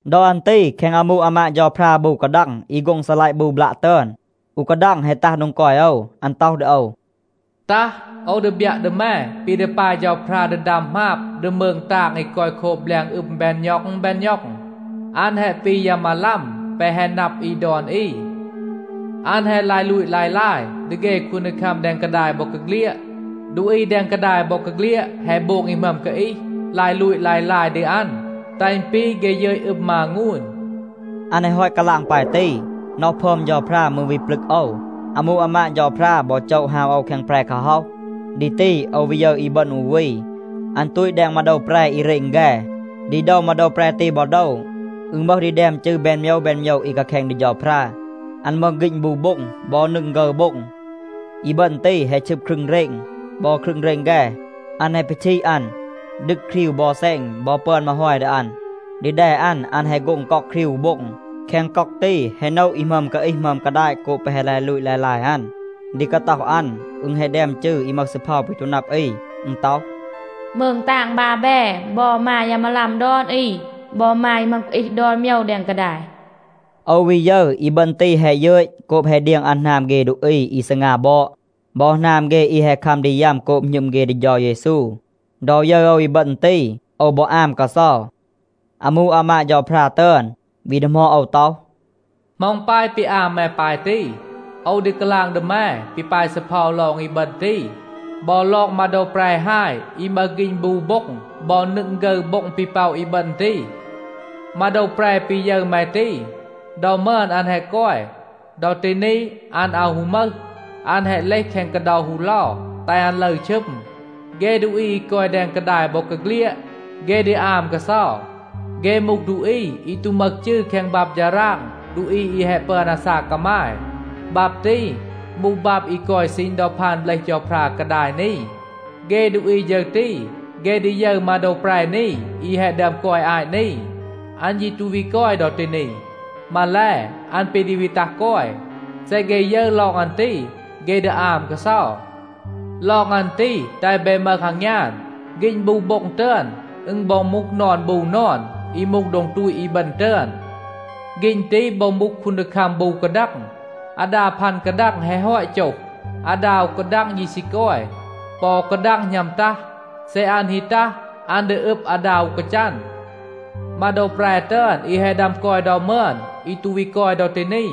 ดอ อัน ตี แคง อามู อามาด เฌาพรา บู กาดัง อี โฆ็ง ซีลัยะ บู บลัะ ตึอน, อู กาดัง แฮะ ตัห โดง กอย โอว. อัน ต็อห ดี โอว, “ตัห, โอว ดี บยัะ ดี แม ปี ดี ปาย เฌาพรา ดี ดัม หมาบ ดี มืง ตาง อี กอย โคบ แบลง อึม แบน ณ็อง แบน ณ็อง. อัน แฮะ ปี ยา มาลัม แปะ แฮะ นับ อี ดอน อี. อัน แฮะ ลาย ลูต ลาย ลาย ดี เฆ คูนดีคัม แดง กาดาย บอกาเฆลียด. ดูอี แดง กาดาย บอกาเฆลียด แฮะ โบง อี หมึอม กาอีห, ลาย ลูต ลาย ลาย ดี อัน, แตห อึณ ปี เฆ ยึต อึม มางูน.” อัน แฮะ ฮอต กาลาง ปาย ตี, น็อห พึอม เฌาพรา มืร วี ปลึก โอว. อามู อามาด เฌาพรา บอ โจะ ฮาว โอว แคง แปร กาฮ็อห. ดี ตี โอว วี ยึร อีบึณ อู วี. อัน ตูต แดง มาโดว แปร อี เรณ แฆ. ดี โดว มาโดว แปร ตี บอ โดว อึณ มึห ดี แดม จืร แบน โมยว แบน โมยว อี กาแคณ ดี เฌาพรา. อัน มึห ฆีณ บู โบ็ง บอ นึง ฆึร โบ็ง. อีบึณ ตี, แฮะ ชึบ ครึง เรณ บอ ครึง เรณ แฆ. อัน แฮะ ปีชีด อัน, ดึก ครีว บอ แซณ บอ ปึอน มาฮอย ดี อัน. ดี แด อัน, อัน แฮะ โฆ็ง ก็อก ครีว อู โบ็ง. แคง ก็อก ตี, แฮะ โนะ อี หมึอม กาอีห, หมึอม กาดาต โกบ แปะ แฮะ ลาย ลูต ลาย ลาย อัน. ดี กาต็อห อัน, อึณ แฮะ แดม จืร อี มึห ซีเพา ปี ตู นับ อี. อึณ ต็อห, “มืง ตาง บาแบ บอ มา ยา มาลัม ดอน อี, บอ มา อี หมึอม กาอีห ดอน โมยว แดง กาดาย.” โอว วี ยึร, อีบึณ ตี แฮะ ยึต โกบ แฮะ เดียง อัน หนาม เฆ ดูอี อี ซีงา บอด บอ หนาม เฆ อี แฮะ คัม ดี ยัม โกบ หณึม เฆ ดี เฌา เยซู. ดอ ยึร โอว อีบึณ ตี, โอว บอ อาม กาเซา. อามู อามาด เฌาพรา ตึอน, วี ดีหมอด โอว ต็อห, “เหมา อึณ ปาย ปี อาม แม ปาย ตี? โอว ดี กาลาง ดี แม ปี ปาย ซีเพา ลอง อีบึณ ตี, บอ ลอง มาโดว แปร ฮาย อี มึห ฆีณ บู โบ็ง บอ นึง ฆึร โบ็ง ปี ป็อะ อีบึณ ตี. มาโดว แปร ปี ยึร แม ตี, ดอ มึอน อัน แฮะ กอย. ดอ ตี นี, อัน อาว ฮู มึห. อัน แฮะ เลห แคง กาเดา ฮูเลา, แตห อัน ลึร ชึม. เฆ ดูอี อี กอย แดง กาดาย บอกาเฆลียด, เฆ ดี อาม กาเซา. เฆ มูห ดูอี อี ตู มึห จืร แคง บับ ฌาราง ดูอี อี แฮะ ปึอน อาซาก กามาย. บับ ตี มูห บับ อี กอย ซีณ ดอ พาน เบลห เฌาพรา กาดาย นี. เฆ ดูอี ฌึร ตี, เฆ ดี ยึร มาโดว แปร นี อี แฮะ ดึอม กอย อาต นี. อัน ยี ตู วี กอย ดอ ตี นี. มาแล, อัน ปี ดี วี ตัห กอย. เซ เฆ ยึร ลอง อัน ตี, เฆ ดี อาม กาเซา. ลอง อัน ตี, แตห เบ มึห อางยาน. ฆีณ บู โบ็ง ตึอน, อึณ บอ มูห นอน บู นอน, อี มูห โดง ตูต อีบึณ ตึอน. ฆีณ ตี บอ มูห คูนดีคัม บู กาดัง. อาดา พัน กาดัง แฮะ ฮอต โจห. อาดา อู กาดัง ยี ซี กอย. ปอ อู กาดัง หณัม ตัห. เซ อัน ฮี ตัห, อัน ดี อึบ อาดา อู กาจัน. มาโดว แปร ตึอน อี แฮะ ดึอม กอย ดอ มึอน, อี ตู วี กอย ดอ ตี นี,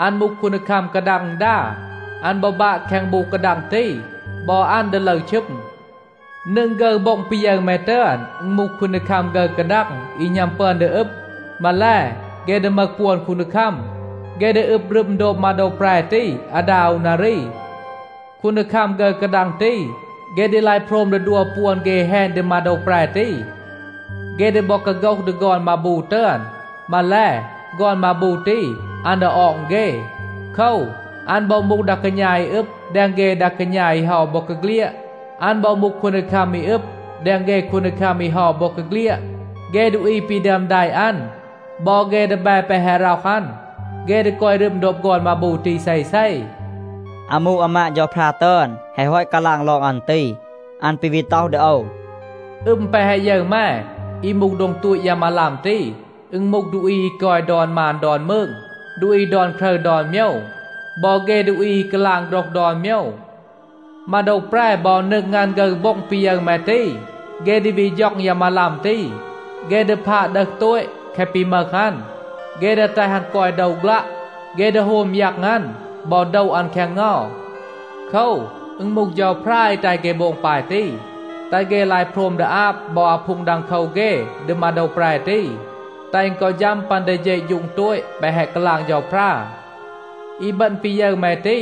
อัน มูห คูนดีคัม กาดัง อึณดา. อัน บอ บาะ แคง บู กาดัง ตี. บอ อัน ดี ลึร ชึม. นึง ฆึร โบ็ง ปี ยึร แม ตึอน, อึณ มูห คูนดีคัม ฆึร กาดัง อี หณัม ปึอน ดี อึบ. มาแล, เฆ ดี มึห ปวน คูนดีคัม. เฆ ดี อึบ รึม โดบ มาโดว แปร ตี อาดา อู นารี. คูนดีคัม ฆึร กาดัง ตี, เฆ ดี ลาย โพรม ดี ดัว ปวน เฆ แฮณ ดี มาโดว แปร ตี. เฆ ดี บอ กาโฆห ดี ฆอน มาบู ตึอน. มาแล, ฆอน มาบู ตี, อัน ดี ออง เฆ. โคว, อัน บอ มูห ดา กาณา อี อึบ แดง เฆ ดา กาณา อี เฮา บอกาเฆลียด. อัน บอ มูห คูนดีคัม อี อึบ แดง เฆ คูนดีคัม อี เฮา บอกาเฆลียด. เฆ ดูอี ปี ดึอม แดะ อัน บอ เฆ ดีแบ แปะ แฮะ ร็อห อัน, เฆ ดี กอย รึม โดบ ฆอน มาบู ตี เซเซ.” อามู อามาด เฌาพรา ตึอน แฮะ ฮอต กาลาง ลอง อัน ตี, อัน ปี วี ต็อห ดี โอว, “อึม แปะ แฮะ ยึร แม, อี มูห โดง ตูต ยา มาลัม ตี, อึณ มูห ดูอี อี กอย ดอน มาน ดอน มืง, ดูอี ดอน ครึร ดอน โมยว, บอ เฆ ดูอี อี กาลาง โฆรห ดอน โมยว. มาโดว แปร บอ นึง อัน ฆึร โบ็ง ปี ยึร แม ตี, เฆ ดี วี ฌ็อง ยา มาลัม ตี. เฆ ดี พาด ดึห โตต แคะ ปี มึห อัน. เฆ ดี แตห อัน กอย โดว ฆลัะ. เฆ ดี โฮม ยัง อัน บอ โดะ อัน แคง เงา. โคว, อึณ มูห เฌาพรา อี แตห เฆ โบง ปาย ตี, แตห เฆ ลาย โพรม ดี อาบ บอ อาพูง ดังโคว เฆ ดี มาโดว แปร ตี, แตห อึณ กอ ฌัม ปัน ดี เฌะฌูง โตต แปะ แฮะ กาลาง เฌาพรา. อีบึณ ปี ยึร แม ตี,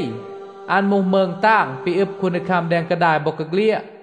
อัน มูห มืง ตาง ปี อึบ คูนดีคัม แดง กาดาย บอกาเฆลียด.”